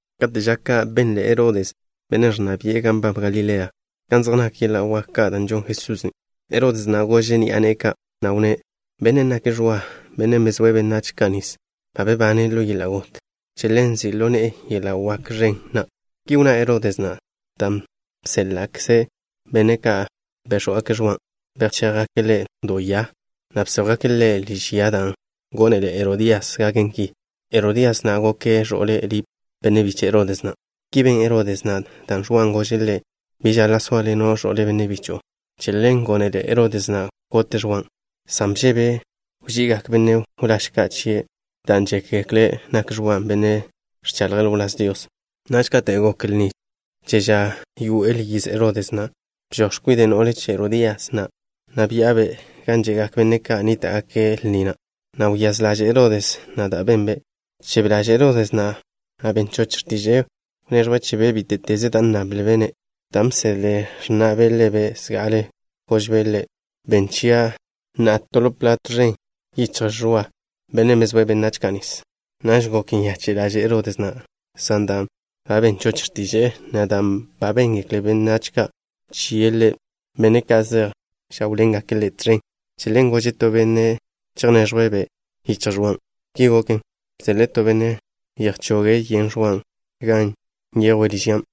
Kate' ža ka', benle Herodes, bennen' ẕnna bi'e gan nbab Galilea, kan zej nak yeḻa' wak ka' da' žon Jesusen'. Herodes na' gože' ni'a ne'e ka', na' wnné': —Bennen' nake' Ẕwa, bennen' bezóe' benách ka' nis. Ba bebane' ḻo yeḻa' got. Che ḻen nzi' ḻo ne'e yeḻa' wak ẕen na'. Ki wnná Herodes na' dan' bséḻa'kze' benne' ka' béx̱wgake' Ẕwan'. Bchéjgake' ḻe' do ya, na' bséjwgake' ḻe' liž ya dan' gónele Herodías gaken ki. Herodías na' goke' ẕo'le Lip, benne' biche' Herodes na'. Ki ben Herodes na', dan' Ẕwan' gože' ḻe': “Bi žaḻa' sóaḻeno' ẕo'le benne' bicho'o.” Che ḻen gónele Herodes na' gote' Ẕwan', san bžebe' wži'igak benne' wláž ka' chie', dan' žékgekle' nak Ẕwan' benne' ẕchaḻje' ḻo wláz Dios. Naž kate' gok lni che ža wyé'el yiz Herodes na', bžoj x̱kwide' no'le che Herodías na', na' bya'abe' gan že'gak benne' ka' nníta'gake' lni na', na' wyáz ḻaže' Herodes na' da' benbe'. Bchebe ḻaže' Herodes na', na' ben choche' x̱tiže'e wneẕjwe' chebe' bíte'teze da' nnablbe' ḻe'. Dan' ba bsedle x̱na'be' ḻebe' zga'ale, gožbe' ḻe': —Benn chia' na'a to ḻo ẕiga' ẕen yichj Ẕwa, bennen' bezóe' benách ka' nis. Naž gok nyache' ḻaže' Herodes na', san dan' ba ben choche' x̱tiže'e, na' dan' béngekle benne' ka' chie' ḻe', benne' ka' že'j žáwḻengake' ḻe' tẕen, che ḻen gože' to benne' chejneẕjwe'-be' yichj Ẕwan'. Ki goken, bseḻe'e to benne' chejchoge' yen Ẕwan' gan nyejwe' liž ya.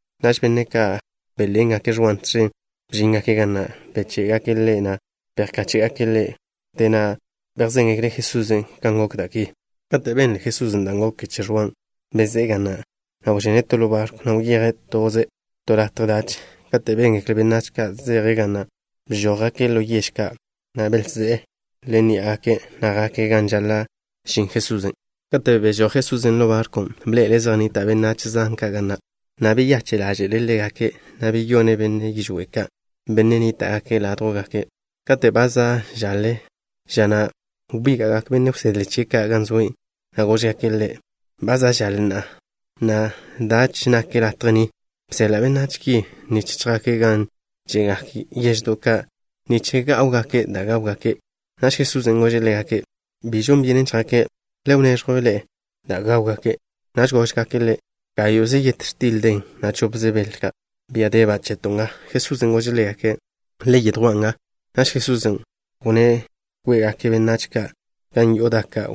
Naž benne' ka' bénḻengake' Ẕwan' tẕen bžíngake' ga na', na' beché'gake' ḻe', na' bejkáche'gake' ḻe'. Wdé na', bejzéngekle' Jesusen' kan gok da' ki. Kate' benle Jesusen' da' goken che Ẕwan', bezé'e ga na', na' wžene' to ḻo barkw, na' wyeje' toze' to latje dach. Katen' béngekle benách ka' zeje' ga na', bžójgake' ḻo yež ka', na' belzé'e ḻo ní'agake', na' jake' gan žaḻa' žin Jesusen'. Kate' bežój Jesusen' ḻo barkw, bḻe'ele' zej nnita' benách zan ka' ga na', na' beyache' ḻáže'le' ḻégake', na' beyone' benne' yižwé' ka', benne' nníta'gake' ládjwgake'. Kate' ba za' žaḻe ža na', wbíga'gak benne' wsedle chie' ka' gan zoe', na' góžgake' Ḻe': —Ba za' žaḻe na'a, na' dache nak latje ni. Beseḻa' benách ki nich chjake' gan že'gak yeždo' ka' nich gá'wgake' da' gáwgake'. Naž Jesusen' gože' ḻégake': —Bi žon byenen chjake'. Le wneẕjw ḻe'e dan' gáwgake'. Naž góžgake' Ḻe': —Gáyo'ze yet x̱til den, na' chopze bel ka', bia deba' cheto' nga. Jesusen' gože' ḻégake': —Le yedjwán' nga. Naž Jesusen' wnné' kwe'gak benne' ka' gan yo'o daka'.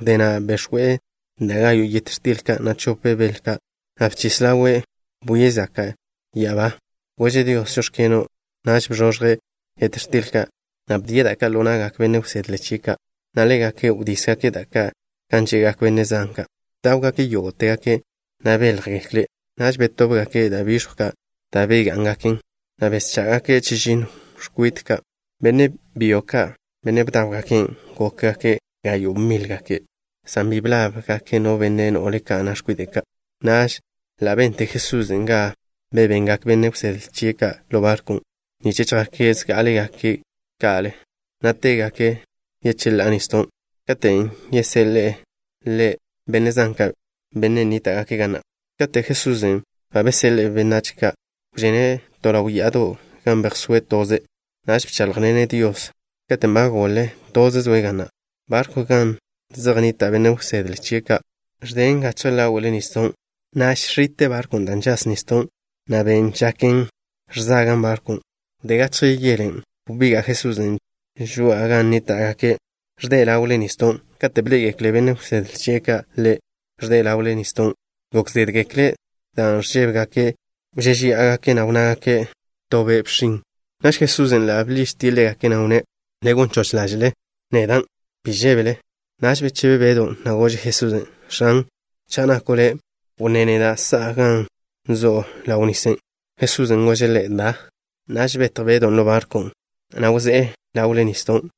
Wdé na' bex̱we' da' gayo' yet x̱til ka', na' chop bel ka', na' bchis ḻawe', bwie' zaka' ya'abá. Gože' Dios: “Žóx̱keno'.” Naž bzoẕje' yet x̱til ka', na' bdie' da' ka' ḻo na'gak benne' wsedle chie' ka', na' ḻégake' wdísgake' da' ka' gan že'gak benne' zan ka'. Bdáwgake' yógo'tegake', na' béljegekle'. Naž betóbgake' da' biẕjw ka' da' begá'ngaken, na' beschá'gake' chežinno x̱kwit ka'. Benne' byo ka', benne' bdáwgaken', gókgake' gayo' mílgake', san bi blab no benne' no'le ka', na' x̱kwide' ka'. Naž ḻa' bente Jesusen' ga bebengak benne' wsedle chie' ka' ḻo barkw nich chjake' zgá'alegake' ka Ḻe', na' tégake' yecheḻá'a nisdon', katen' yeseḻe'e Ḻe' benne' zan ka', benne' nníta'gake' ga na'. Katen' Jesusen' ba beseḻe'e benne' ka', wžene' to ḻaw ya'ado' gan bejsóe' toze'. Naž bcháḻjḻene' Dios. Katen' ba goḻe, toze' zoe' ga na'. Barkwn' gan zej nnita' benne' wsedle chie' ka' ẕden gachje ḻáwe'le nisdon', na' žx̱ite' barkwn' dan' žas nisdon', na' ben' žaken ẕzagan' barkwn'. Wdé gachje yelen', wbiga' Jesusen' žoa'a gan nníta'gake', ẕde' ḻawe'l nisdon'. Kate' bḻé'egekle benne' wsedle chie' ka' Ḻe', ẕde' ḻawe'l nisdon', gok zédgekle' dan' ẕžébegake'. Wžéžeya'agake', na' wnnágake': —To be' bxin'. Naž Jesusen' ḻa' bḻižtie' ḻégake', na' wnné': —Le gon choch ḻáže'le. Nedan'. Bi žébele. Naž bechebe Bedw, na' gože' Jesusen': —X̱an, cha' nako' Le', wnné neda' sa'a gan zo' ḻawe'l nisen'. Jesusen' gože' ḻe': —Da. Naž betj Bedon' ḻo barkwn', na' wzé'e ḻawe'l nisdon',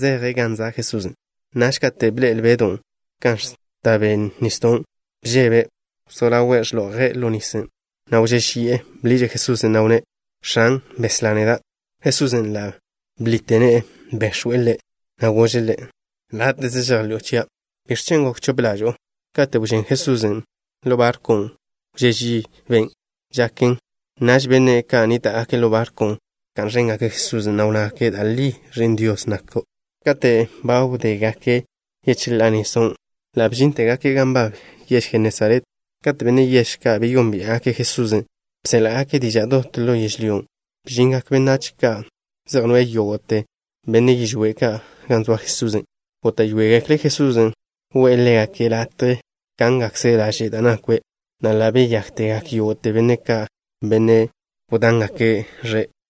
zeje' gan zoa Jesusen'. Naž kate' bḻe'el Bedon' kan ẕta be' nisdon', bžebe'. Wzó ḻawe' žetje' ḻo nisen', na' wžéžeyi'e. Bḻiže' Jesusen', na' wnné': —X̱an, beslá neda'. Jesusen' ḻa' bḻite ne'e. Bex̱we' ḻe', na' gože' ḻe': —Láte'ze žejḻi'o chia'. ¿Biẕ chen' gok chope ḻažo'o? Kate' wžén Jesusen' ḻo barkwn', wžé' ži ben' žaken. Naž benne' ka' nníta'gake' ḻo barkwn' bka'n ẕéngake' Jesusen', na' wnnágake': —Da' li, Ẕi'n Dios nako'. Kate' ba wdégake' yecheḻá'a nisdon', ḻa' bžíntegake' gan nbab yež Jenesaret. Kate' benne' yežen' ka' beyónbia'gake' Jesusen', bséḻa'gake' diža' dot ḻo yežlyón', na' bžingak benách ka' zej noe'e yógo'te benne' yižwé' ka' gan zoa Jesusen'. Góta'yoegekle' Jesusen' we'e ḻégake' latje kángakze' laže' da' nakwe', na' ḻa' beyáktegak yógo'te benne' ka', benne' wdángake' ẕe'.